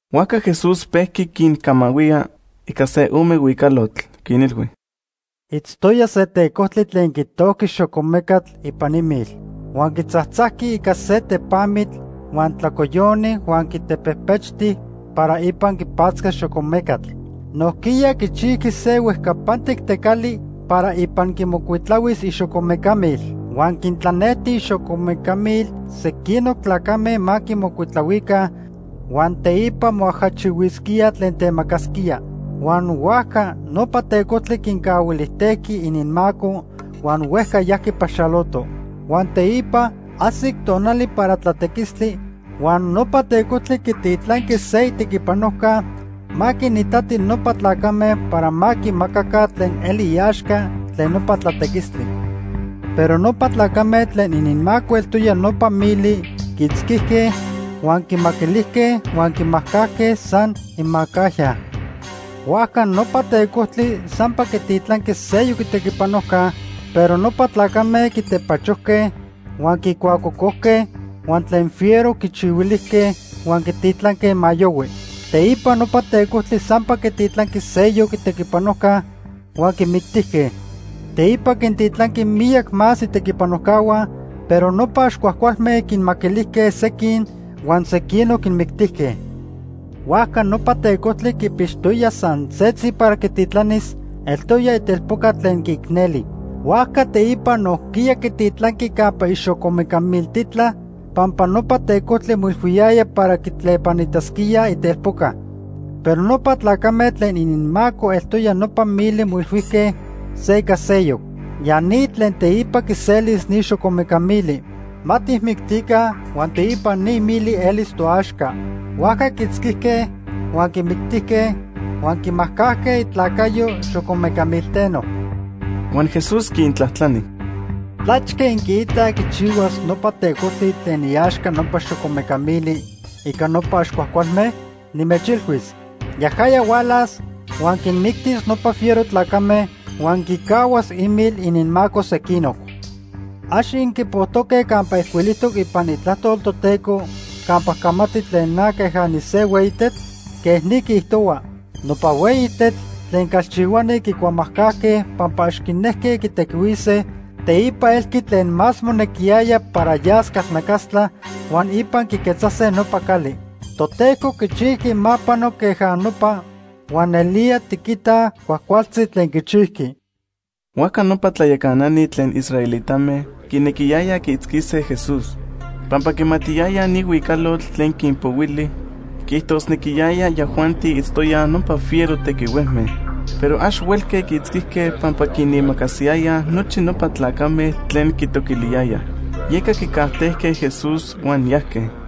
Huajca Jesús pejqui quincamahuía ica se ome huicalotl. Quinilhui: “Itztoya se tecojtli tlen quitojqui xocomecatl ipan imil. Huan quitzajtzajqui ica se tepamitl huan tlacoyoni huan quitepejpechti para ipan quipatzcas xocomecatl. Nojquiya quichijqui se huejcapantic tecali para ipan quimocuitlahuis ixocomeca mil. Huan quintlanejti ixocomeca mil sequinoc tlacame ma quimocuitlahuica huan teipa moajachihuisquíaj tlen temacasquía. Huan huajca nopa tecojtli quincahuilijtejqui ininmaco huan huejca yajqui paxaloto. Huan teipa ajsic tonali para tlatequistli, huan nopa tecojtli quititlanqui se itequipanojca ma quinitati nopa tlacame para ma quimacaca tlen eli iaxca tlen nopa tlatequistli. Pero nopa tlacame tlen ininmaco eltoya nopa mili quiitzquijque, huan quimaquilijque huan quimajcajque san imacajya. Huajca nopa tecojtli sampa quititlanqui seyoc itequipanojca, pero nopa tlacame quitepachojque, huan quicuacocojque, huan tlen fiero quichihuilijque huan quititlanque ma yohui. Teipa nopa tecojtli sampa quititlanqui seyoc itequipanojca huan quimictijque. Teipa quintitlanqui miyac más itequipanojcahua, pero nopa ax cuajcualme quinmaquilijque sequin huan sequinoc quinmictijque. “Huajca nopa tecojtli quipixtoya san setzi para quititlanis, eltoya itelpoca tlen quiicneli. Huajca teipa nojquiya quititlanqui campa ixocomeca miltitla, pampa nopa tecojtli moilhuiyaya para quitlepanitasquíaj itelpoca. Pero nopa tlacame tlen ininmaco eltoya nopa mili moilhuijque se ica seyoc: ‘Ya ni tlen teipa quiselis ni xocomeca mili. Ma tijmictica huan teipa ni mili elis toaxca.’ Huajca quiitzquijque, huan quimictijque huan quimajcajque itlacayo xocomeca milteno.” Huan Jesús quintlajtlani: “¿Tlachque inquiitaj quichihuas nopa tecojtli tlen iaxca nopa xocomeca mili ica nopa ax cuajcualme? Nimechilhuis, yajaya hualas, huan quinmictis nopa fiero tlacame huan quicahuas imil ininmaco sequinoc. ¿Ax inquipojtoque campa ijcuilijtoc ipan Itlajtol Toteco campa camati tlen na queja nise hueyi tetl? Quej ni quiijtohua: ‘Nopa hueyi tetl tlen calchihuani quicuamajcajque pampa ax quinejque quitequihuise, teipa elqui tlen más monequiyaya para yas calnacastla, huan ipan quiquetzase nopa cali. Toteco quichijqui ma pano queja nopa huan nelía tiquitaj cuajcualtzi tlen quichijqui.’” Huajca nopa tlayacanani tlen israelitame quinequiyayaj quiitzquise Jesús pampa quimatiyayaj ni huicalotl tlen quinpohuili quiijtosnequiyaya yajuanti itztoyaj nopa fiero tequihuejme. Pero ax huelque quiitzquise pampa quinimacasiyayaj nochi nopa tlacame tlen quitoquiliyayaj. Yeca quicajtejque Jesús huan yajque.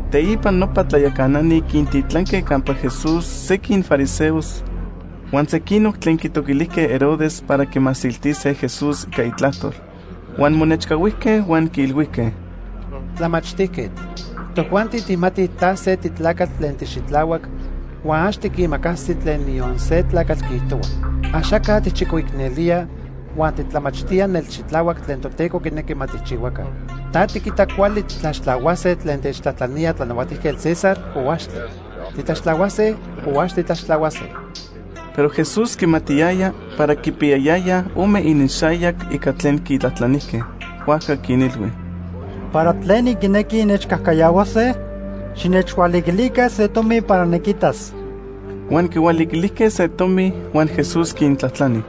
Teipa nopa tlayacanani quintitlanque campa Jesús sequin fariseos huan sequinoc tlen quitoquilijque Herodes para quimasiltise Jesús ica itlajtol. Huan monechcahuijque huan quiilhuijque: ―Tlamachtijquetl, tojuanti tijmatij ta se titlacatl tlen tixitlahuac huan ax tiquimacasi tlen niyon se tlacatl quiijtohua. Axaca tijchicoicnelía huan titlamachtía nelxitlahuac tlen Toteco quinequi ma tijchihuaca. ¿Ta tiquita cuali titlaxtlahuase tlen techtlajtlanía Tlanahuatijquetl César, o axtle? ¿Titlaxtlahuase o ax titlaxtlahuase? Pero Jesús quimatiyaya para quipiyayayaj ome ininxayac ica tlen quitlajtlanijque. Huajca quinilhui: ―¿Para tlen inquinequij innechcajcayahuase? Xinechhualiquilica se tomi para niquitas. Huan quihualiquilijque se tomi, huan Jesús quintlajtlani: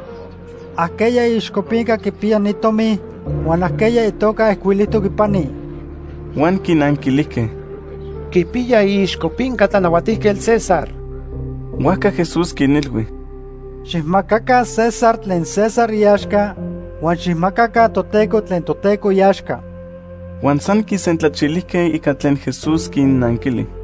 ―¿Ajqueya iixcopinca quipiya ni tomi huan ajqueya itoca ijcuilijtoc ipani? Huan quinanquilijque: ―Quipiya iixcopinca Tlanahuatijquetl César. Huajca Jesús quinilhui: ―Xijmacaca César tlen César iaxca, huan xijmacaca Toteco tlen Toteco iaxca. Huan san quisentlachilijque ica tlen Jesús quinnanquili.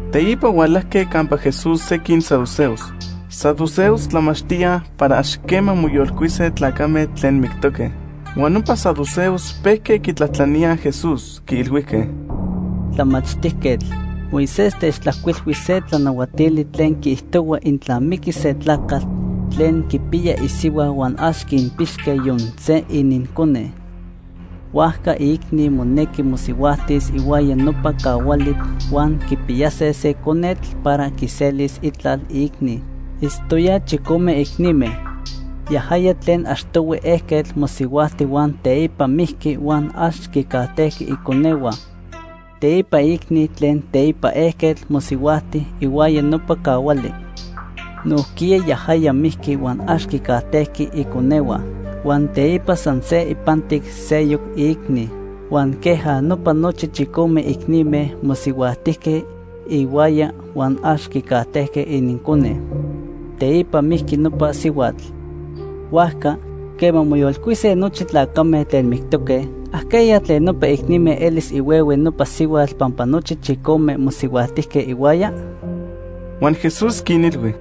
Teipa hualajque campa Jesús sequin saduceos. Saduceos tlamachtíaj para ax quema moyolcuise tlacame tlen mictoque. Huan nopa saduceos pejque quitlajtlaníaj Jesús, quiilhuijque: ―Tlamachtijquetl, Moisés techtlajcuilhui se tlanahuatili tlen quiijtohua intla miquis se tlacatl tlen quipiya isihua huan ax quinpixque yon se inincone, huajca iicni monequi mosihuajtis ihuaya nopa cahuali huan quipiyase se conetl para quiselis itlal iicni. Itztoyaj chicome icnime. Yajaya tlen achtohui ejquetl mosihuajti huan teipa mijqui huan ax quicajtejqui iconehua. Teipa iicni tlen teipa ejquetl mosihuajti ihuaya nopa cahuali. Nojquiya yajaya mijqui huan ax quicajtejqui iconehua. Huan teipa san se ipantic seyoc iicni. Huan queja nopa nochi chicome icnime mosihuajtijque ihuaya huan ax quicajtejque inincone. Teipa mijqui nopa sihuatl. Huajca, quema moyolcuise nochi tlacame tlen mictoque, ¿ajqueya tlen nopa icnime elis ihuehue nopa sihuatl pampa nochi chicome mosihuajtijque ihuaya? Huan Jesús quinilhui: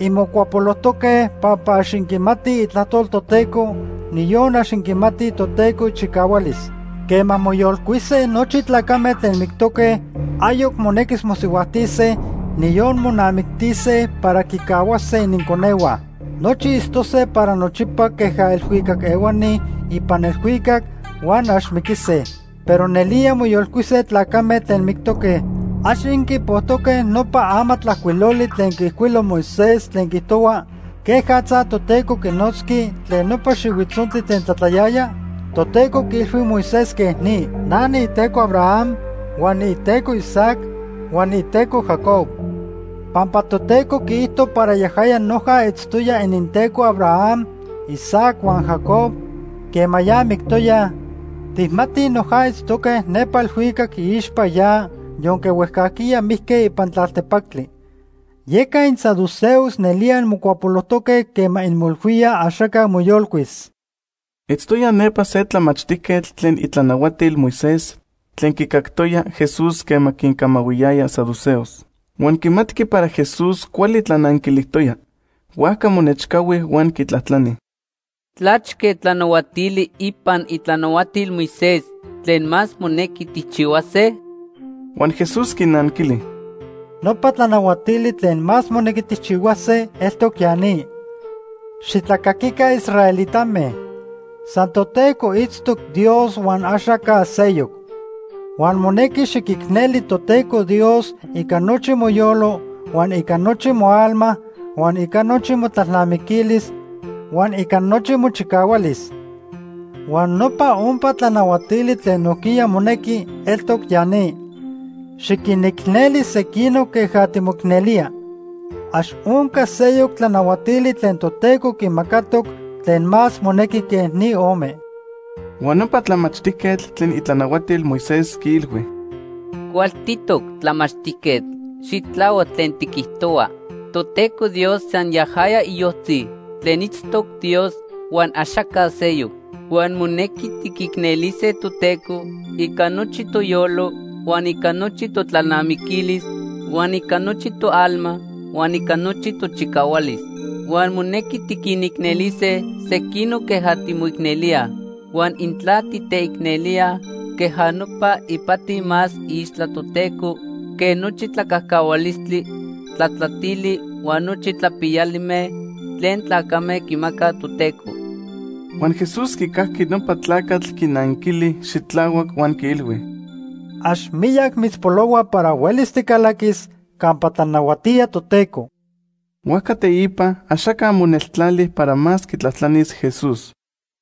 ―Inmocuapolojtoque pampa ax inquimatij Itlajtol Toteco, niyon ax inquimatij Toteco ichicahualis. Quema moyolcuise nochi tlacame tlen mictoque, ayoc monequis mosihuajtise, niyon monamictise para quicahuase ininconehua. Nochi itztose para nochipa queja elhuicac ehuani ipan elhuicac huan ax miquise. Pero nelía moyolcuise tlacame tlen mictoque. ¿Ax inquipojtoque nopa amatlajcuiloli tlen quiijcuilo Moisés tlen quiijtohua quejatza Toteco quinotzqui tlen nopa xihuitzontli tlen tlatlayaya? Toteco quiilhui Moisés quej ni: ‘Na niiTeco Abraham, huan niiTeco Isaac, huan niiTeco Jacob.’ Pampa Toteco quiijto para yajaya noja itztoya ininTeco Abraham, Isaac huan Jacob quema ya mictoyaj, tijmatij noja itztoque nepa elhuicac iixpa ya yonque huejcajquiya mijque ipan tlaltepactli. Yeca insaduceos nelía inmocuapolojtoque quema inmoilhuíaj axaca moyolcuis. Itztoya nepa se tlamachtijquetl tlen itlanahuatil Moisés tlen quicactoya Jesús quema quincamahuiyaya saduceos. Huan quimatqui para Jesús cuali tlananquilijtoya. Huajca monechcahui huan quitlajtlani: ―¿Tlachque tlanahuatili ipan itlanahuatil Moisés tlen más monequi tijchihuase? Huan Jesús quinanquili: ―Nopa tlanahuatili tlen más monequi tijchihuase eltoc ya ni: ‘Xitlacaquica israelitame, san Toteco itztoc Dios huan axaca seyoc. Huan monequi xiquicneli Toteco Dios ica nochi moyolo huan ica nochi moalma, huan ica nochi motlalnamiquilis huan ica nochi mochicahualis.’ Huan nopa ompa tlanahuatili tlen nojquiya monequi eltoc ya ni: ‘Xiquinicneli sequinoc queja timoicnelía.’ Ax onca seyoc tlanahuatili tlen Toteco quimacatoc tlen más monequi que ni ome. Huan nopa tlamachtijquetl tlen itlanahuatil Moisés quiilhui: ―Cualtitoc tlamachtijquetl. Xitlahuac tlen tiquijtohua. Toteco Dios san yajaya iyojtzi tlen itztoc Dios, huan axaca seyoc. Huan monequi tiquicnelise Toteco ica nochi toyolo, huan ica nochi totlalnamiquilis, huan ica nochi toalma huan ica nochi tochicahualis. Huan monequi tiquinicnelise sequinoc queja timoicnelíaj. Huan intla titeicnelíaj queja nopa, ipati más iixtla Toteco quej nochi tlacajcahualistli tlatlatili huan nochi tlapiyalime tlen tlacame quimacaj Toteco. Huan Jesús quicajqui nopa tlacatl quinanquili xitlahuac huan quiilhui: ―Ax miyac mitzpolohua para huelis ticalaquis campa tlanahuatía Toteco. Huajca teipa axaca moneltlali para más quitlajtlanis Jesús.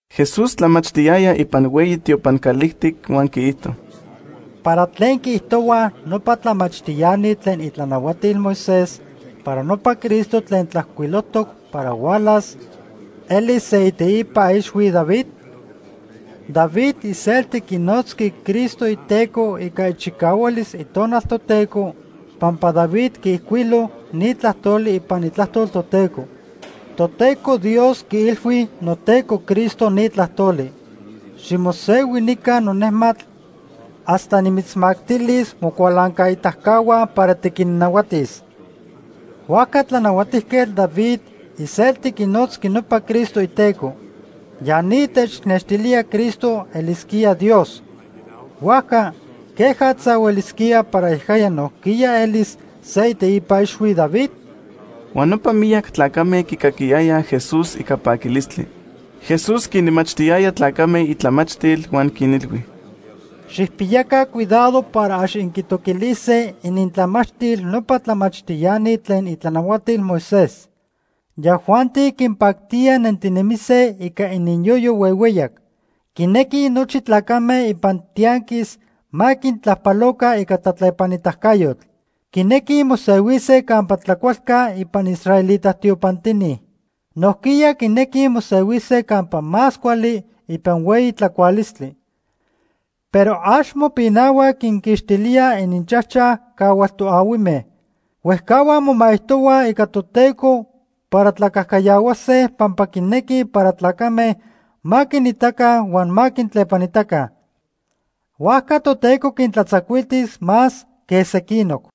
Jesús tlamachtiyaya ipan hueyi tiopan calijtic huan quiijto: ―¿Para tlen quiijtohuaj nopa tlamachtiani tlen itlanahuatil Moisés para nopa Cristo tlen tlajcuilojtoc para hualas elis se iteipa ixhui David? David iselti quinotzqui Cristo iTeco ica ichicahualis Itonal Toteco pampa David quiijcuilo ni tlajtoli ipan Itlajtol Toteco: ‘Toteco Dios quiilhui noTeco Cristo ni tlajtoli: Ximosehui nica nonejmatl hasta nimitzmactilis mocualancaitacahua para tiquinnahuatis.’ Huajca Tlanahuatijquetl David iselti quinotzqui nopa Cristo iTeco. Ya ni technextilía Cristo elisquía Dios. Huajca ¿quejatza huelisquía para yajaya nojquiya elis se iteipa ixhui David? Huan nopa miyac tlacame quicaquiyayaj Jesús ica paquilistli. Jesús quinmachtiyaya tlacame itlamachtil huan quinilhui: “Xijpiyaca cuidado para ax inquintoquilise inintlamachtil nopa tlamachtiani tlen itlanahuatil Moisés. Yajuanti quinpactía nentinemise ica ininyoyo huehueyac. Quinequij nochi tlacame ipan tianquis ma quintlajpaloca ica tlatlepanitacayotl. Quinequij mosehuise campa tlacualca ipan israelita tiopantini. Nojquiya quinequij mosehuise campa más cuali ipan hueyi tlacualistli. Pero ax mopinahuaj quinquixtilíaj ininchajchaj cahual toahuime. Huejcahuaj momaijtohuaj ica Toteco para tlacajcayahuase pampa quinequij para tlacame ma quinitaca huan ma quintlepanitaca. Huajca Toteco quintlatzacuiltis más quej sequinoc.”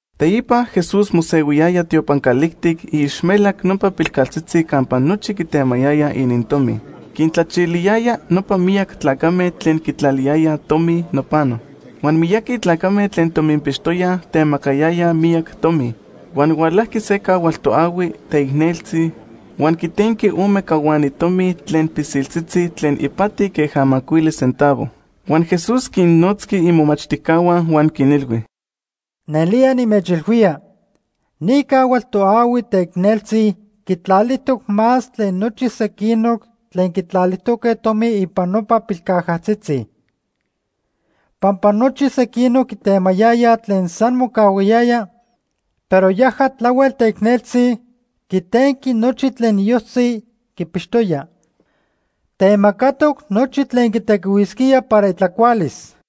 Teipa Jesús mosehuiyaya tiopan calijtic iixmelac nopa pilcajatzitzi campa nochi quitemayayaj inintomi. Quintlachiliyaya nopa miyac tlacame tlen quitlaliyayaj tomi nopano. Huan miyaqui tlacame tlen tominpixtoyaj temacayayaj miyac tomi. Huan hualajqui se cahual toahui teicneltzi huan quitenqui ome cahuani tomi tlen pilsiltzitzi tlen ipati queja macuili centavo. Huan Jesús quinnotzqui imomachtijcahua huan quinilhui: ―Nelía nimechilhuía, ni cahual toahui teicneltzi quitlalijtoc más tlen nochi sequinoc tlen quitlalijtoque tomi ipan nopa pilcajatzitzi. Pampa nochi sequinoc quitemayayaj tlen san mocahuayaya, pero yaja tlahuel teicneltzi, quitenqui nochi tlen iyojtzi quipixtoya. Temacatoc nochi tlen quitequihuisquía para itlacualis.